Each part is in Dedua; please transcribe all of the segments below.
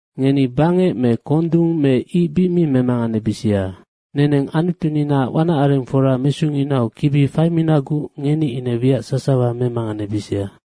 “Ngeni bangec me kondung me ic bic mi memanganebisia. Neneng Anutuninaac wanacarengfora mesunginau kibi faiminaguc ngeni ine wiac sasawa memanganebisia.”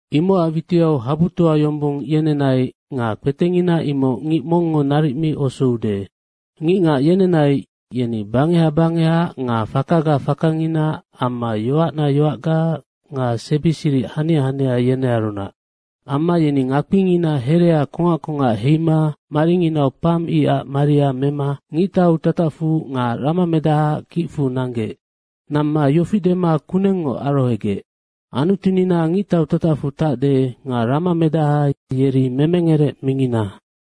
Imocac witiau habutoa yombong yenenai nga kpetengina imoc ngic mongngo naric mi osoude. Ngicngac yenenai, yeni bangeha bangeha nga fakaga fakangina amma yoacna yoacga nga sebi siric hania hania, yenearunac. Amma yeni ngakpingina herea kongac kongac heima maringinau pam icac maria mema ngictau tatacfu nga ramamedahaac kicfu nanggec. Namma yofi dema kunengngoc arohogec, “Anutunina ngictau tatacfu tacde nga ramamedaha yeri memengerec mingina.”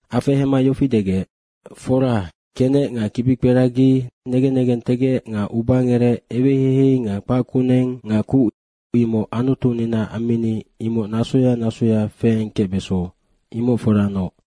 Afehema yofi degec, “Fora, kenec nga kibikperagi, negen negentegec nga ubangerec, eweheihei nga kpac kuneng nga kuc imoc Anutunina ammini nasoya nasoya feengkecbeso, imoc foranoc.”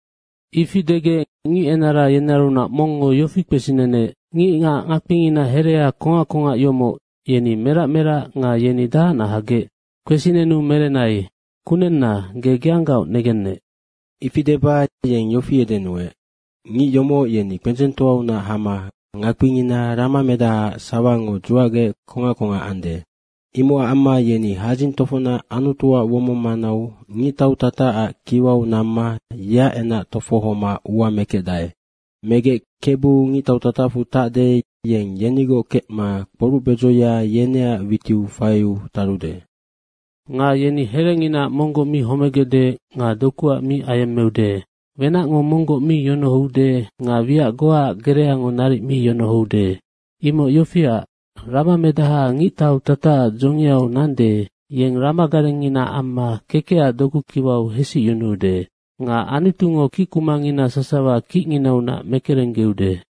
Ifi degec, ngic enara yenearunac mongngo yofi kpesinenec, “Ngicngac ngakpingina herea kongac kongac yomoc, yeni merac merac nga yeni dahacnac hagec?” Kpesinenu merenai, “Kunenna, ge geanggaoc negennec.” ifi deba yeng yofi edenuec, “Ngic yomoc yeni kpendzengtoaunac hama ngakpingina ramamedahaac sawango dzuacgec kongac kongac ande. Imocac amma yeni hadzing tofocnac Anutuac womong manau ngictau tatacac kiwau namma yeac kingang kpema ua mekecdae. Megec Kebu ngictau tatacfu tacde, yeng yenigoc kecma kporucbedzoya yeneac witiu faiu tarude. Nga yeni herenginaac monggoc mi homegecde nga dokuac mi ayemmeude. Wenacngo monggoc mi yonohoude nga wiac goaac gereango naric mi yonohoude. Imoc yofiac, ramamedaha ngictau tatacac dzongiau nande, yeng ramagarengngina amma kekecac dokukiwau hesicyunuude. Nga Anutungo kickumangina sasawa kicnginaunac mekerenggeude.”